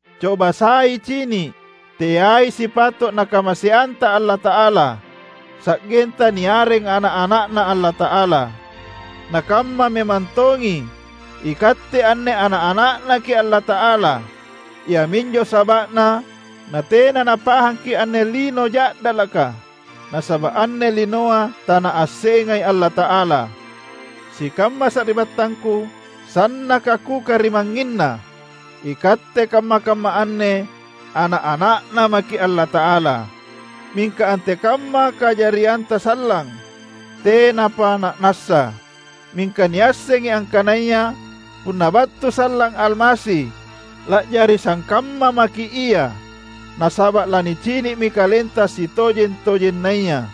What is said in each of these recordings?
Coba sai cini’! Teai sipato’ Nakamaseanta Allata’ala, sa’genta niareng ana’-ana’Na Allata’ala; na kamma memang tongi, ikatte anne ana’-ana’Naki’ Allata’ala. Iaminjo saba’na natena napahangki’ anne lino ja’dalaka, nasaba’ anne linoa tanaassengai Allata’ala. Sikamma sari’battangku sannaka kukarimangnginna! Ikatte kamma-kamma anne ana’-ana’Na maki’ Allata’ala, mingka antekamma kajarianta sallang, tenapa na’nassa. Mingka niassengi angkanaya punna battu sallang Almasi, la’jari sangkamma maki’ Ia, nasaba’ lanicini’mi kalenta sitojeng-tojennaya.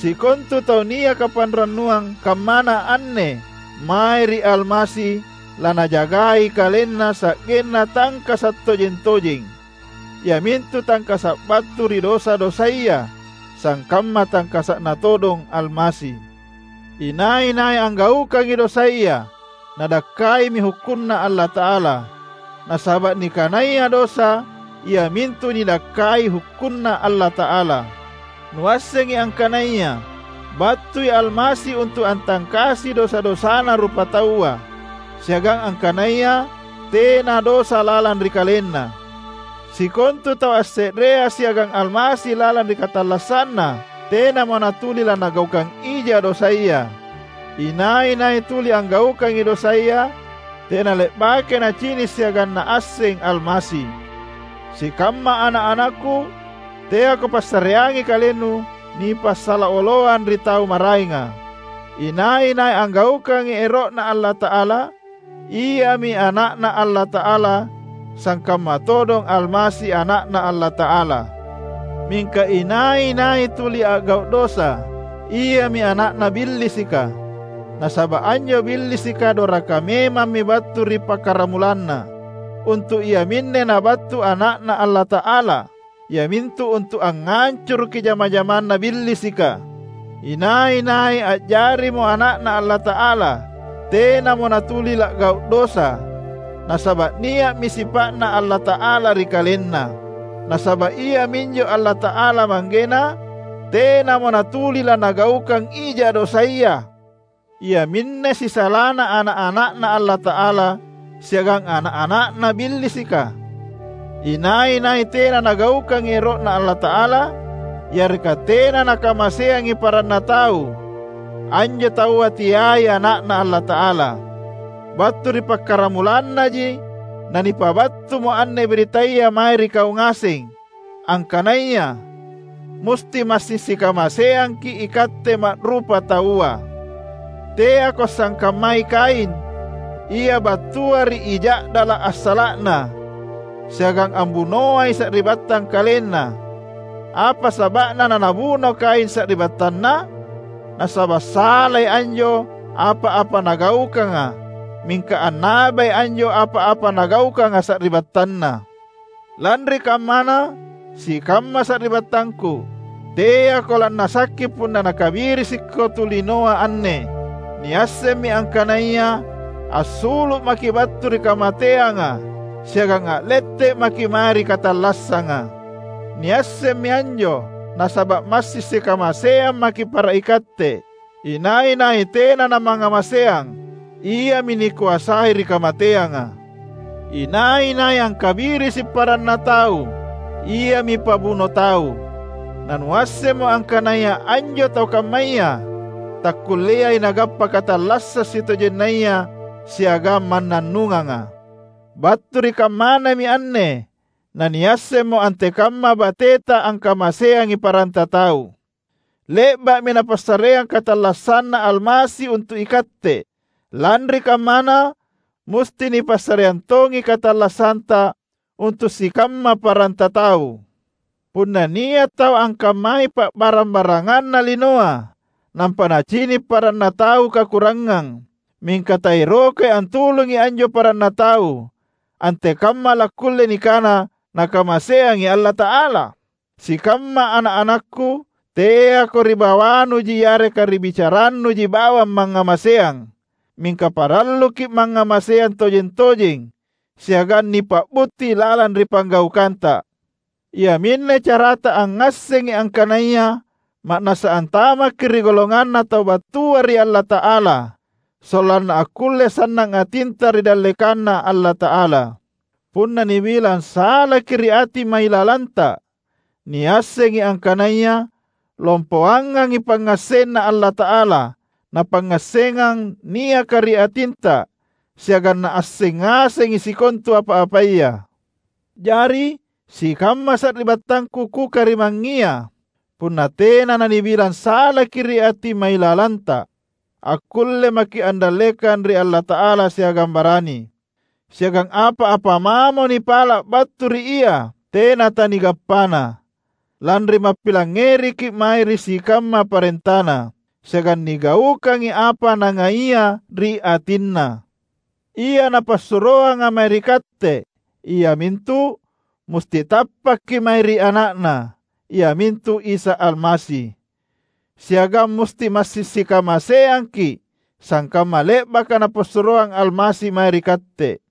Sikontu tau niaka panrannuang kammana anne mae ri Almasi lanajagai kalenna sa’genna tangkasa’ tojeng-tojeng, iamintu tangkasa’ battu ri dosa-dosaya sangkamma tangkasa’Na todong Almasi. Inai-nai anggaukangi dosaya, nadakkaimi hukkunNa Allata’ala, nasaba’ nikanaya dosa iamintu nidakkai hukkunNa Allata’ala. Nuassengi angkanaya battui Almasi untu’ antangkasi dosa-dosana rupataua, siagang angkanaya tena dosa lalang ri KalenNa. Sikontu tau asse’rea siagang Almasi lalang ri katallassanna, tenamo natuli lanagaukang ija dosaya. Inai-nai tuli anggaukangi dosaya, tenale’bakai nacini’ siagang naasseng Almasi. Sikamma ana’-anakku, teako passareangi kalennu nipasala oloang ri tau maraenga. Inai-nai anggaukangi ero’Na Allata’ala, iami ana’Na Allata’ala sangkamma todong Almasi Ana’Na Allata’ala. Mingka inai-nai tuli a’gau’ dosa, iami ana’na Billisika, nasaba’ anjo Billisika doraka memammi battu ri pakkaramulanna. Untu’ iaminne Nabattu Ana’Na Allata’ala, iamintu untu’ angngancuruki jama-jamanna Billisika. Inai-nai a’jarimo ana’Na Allata’ala, tenamo natuli la’gau’ dosa, nasaba’ nia’mi sipa’Na Allata’ala ri kalenna. Nasaba’ iaminjo Allata’ala Manggena, tenamo natuli lanagaukang ija dosaya. Iaminne sisalana ana’-ana’Na Allata’ala siagang ana’-ana’na Billisika: inai-nai tena nagaukangi ero’Na Allata’ala, yareka tena nakamaseangi paranna tau, anjo taua teai ana’Na Allata’ala. Battu ri pakkaramulannaji nanipabattumo anne birittaya mae ri kau ngaseng, angkanaya: musti massing sikamaseangki’ ikatte ma’rupataua. Teako sangkammai Kain, ia battua ri I Ja’dala’ assala’na, siagang ambunoai sari’battang kalenna. Apa saba’na nanabuno Kain sari’battanna? Nasaba’ salai anjo apa-apa nagaukanga mingka annabai anjo apa-apa nagaukanga sari’battanna. Lanri kammana, sikamma sari’battangku, teako lannasakki punna nakabirisiko tu linoa anne. Niassemmi angkanaya assulu’ maki’ battu ri kamateanga siagang a’lette’ maki’ mae ri katallassanga. Niassemmi anjo, nasaba’ massing sikamaseang maki’ para ikatte. Inai-nai tena namangngamaseang, iami nikoasai ri kamateanga. Inai-nai angkabirisi paranna tau iami pabuno tau; na nuassemmo angkanaya anjo tau kammaya takkulleai nagappa katallassang sitojennaya siagang mannannunganga. Battu ri kammanami anne naniassemmo antekamma bateta angkamaseangi paranta tau. Le’ba’mi Napassareang katallassanNa Almasi untu’ ikatte. Lanri kammana, musti nipassareang tongi katallassanta untu’ sikamma paranta tau! Punna nia’ tau angkammai pa’barang-baranganna linoa, nampa nacini’ paranna tau kakurangang, mingka taerokai antulungi anjo paranna tau, antekamma lakkulle nikana nakamaseangi Allata’ala? Sikamma ana’-anakku! Teako ri bawanuji yareka ri bicarannuji bawang mangngamaseang. Mingka paralluki’ mangngamaseang tojeng-tojeng, siagang nipa’butti lalang ri panggaukanta. Iaminne carata angngassengi angkanaya ma’nassa antamakki’ ri golonganna tau battua ri Allata’ala, sollanna akkulle sannang atinta ri dallekanNa Allata’ala. Punna nibilang salaki’ ri ati mailalanta, niassengi angkanaya lompoangangi pangngassenNa Allata’ala na pangngassengang niaka ri atinta siagang Naasseng ngasengi sikontu apa-apaya. Jari, sikamma sari’battangku kukarimangngia, punna tena nanibilang salaki’ ri ati mailalanta, akkulle maki’ andallekang ri Allata’ala siagang barani. Siagang apa-apa mamo nipala’ battu ri Ia, tena tanigappana, lanri mappilangngeriki’ mae ri sikamma parentaNa, siagang nigaukangi apa Nangaia ri atinNa. Ia Napassuroanga mae ri katte iamintu: musti tappakki’ mae ri Ana’Na, iamintu Isa Almasi; siagang musti massing sikamaseangki’, sangkamma le’baka Napassuroang Almasi mae ri katte.